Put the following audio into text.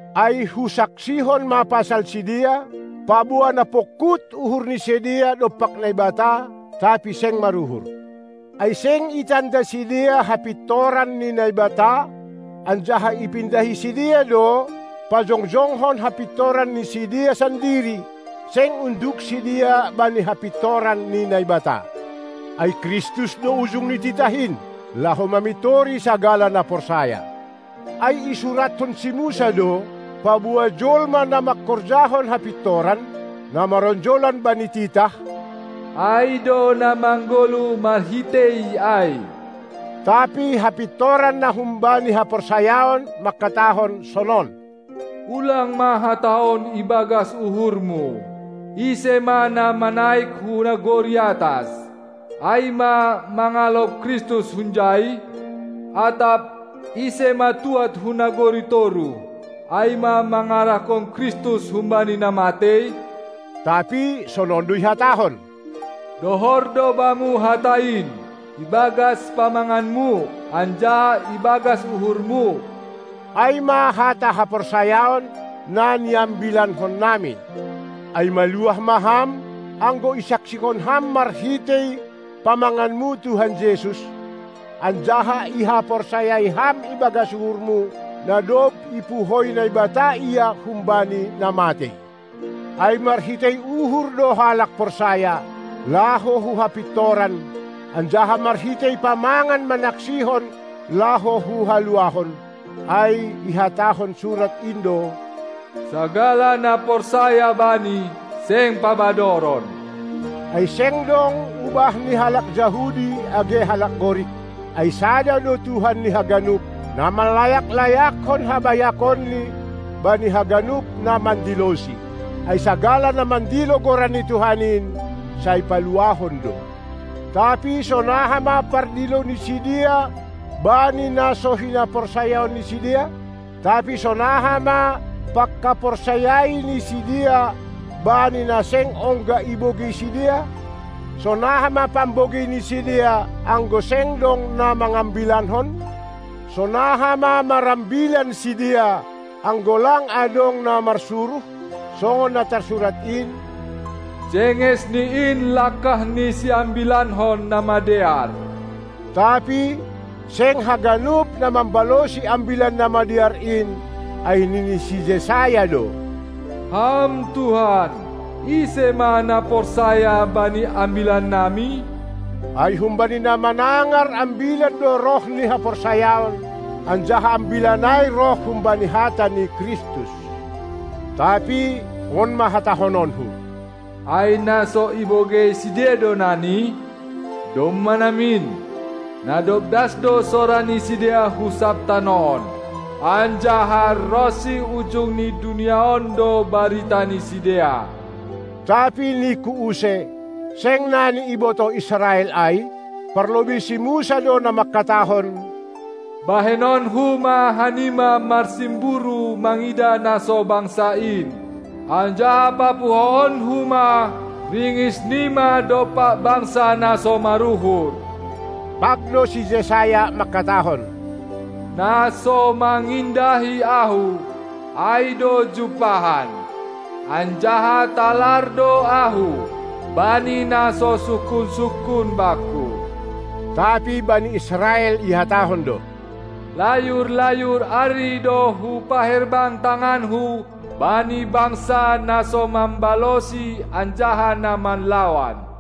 Ai husaksihon ma pasal sidea, paboa na pongkut uhur ni sidea dompak Naibata, tapi seng maruhur. Ai seng itanda sidea hapintoran ni Naibata anjaha ipindahi sidea do, pajongjongkon hapintoran ni sidea sandiri, seng unduk sidea bani hapintoran ni Naibata. Ai Kristus do ujung ni titah in, laho mamintori sagala na porsaya. Ai isurathon si Musa do, paboa jolma na mangkorjahon hapintoran, na maronjolan bani titah, ai do na manggoluh marhitei ai. Tapi hapintoran na humbani haporsayaon mangkatahon sonon: Ulang ma hatahon ibagas uhurmu: Ise ma na manaik hu nagori atas, ai ma, mangalop Kristus hunjai? Atap: Ise ma tuad hu nagori toruh, ai ma, mangarahkon Kristus humbani na matei? Tapi sonon do ihatahon: Dohor do bamu hata in, ibagas pamanganmu anjaha ibagas uhurmu. Ai ma hata haporsayaon, na niambilankonnami. Ai maluah ma ham, anggo isaksihon ham marhitei pamanganmu Tuhan Jesus, anjaha ihaporsayai ham ibagas uhurmu, na dob ipuhoi Naibata Ia humbani na matei. Ai marhitei uhur do halak porsaya, laho hu hapintoran, anjaha marhitei pamangan manaksihon laho hu haluahon. Ai ihatahon surat in do: Sagala na porsaya Bani, seng pabadoron. Ai seng dong ubahni halak Jahudi age halak Gorik, ai Sada do Tuhan ni haganup, na manlayak-layakkon habayakonNi bani haganup na mandiloSi. Ai sagala na mandilo Goran ni Tuhan in, sai paluahon do. Tapi sonaha ma pardilo ni sidea Bani na so hinaporsayaon ni sidea? Tapi sonaha ma pangkaporsayai ni sidea bani na seng ongga ibogei sidea? Sonaha ma pambogei ni sidea, anggo seng dong na mangambilankon? Sonaha ma marambilan sidea, anggo lang adong na marsuruh? Songon na tarsurat in: Jenges ni in langkah ni siambilankon na madear. Tapi seng haganup na mambalosi Ambilan Namadear in, ai nini si Jesayas do: Ham Tuhan, ise ma na porsaya bani ambilannami? Ai humbani na manangar ambilan do roh ni haporsayaon, anjaha ambilan ai roh humbani hata ni Kristus. Tapi on ma hatahononku: Ai na so ibogei sidea do nani? Domma namin! Na dob das do sora ni sidea hu sab tanoh on, anjaha ronsi ujung ni dunia on do barita ni sidea. Tapi ningku use: Seng nani ibotoh Israel ai? Parlobei si Musa do na mangkatahon: Bahenonku ma hanima marsimburu mangidah na so bangsa in, anjaha papuhoonku ma ringisnima dompak bangsa na so maruhur. Pag do si Jesayas mangkatahon: Na so mangindahi Ahu, ai do jumpahan, anjaha talar do Ahu bani na so sungkun-sungkun Bangku. Tapi bani Israel ihatahon do: Layur-layur ari do hupaherbang tanganku bani bangsa na so mambalosi anjaha na manlawan.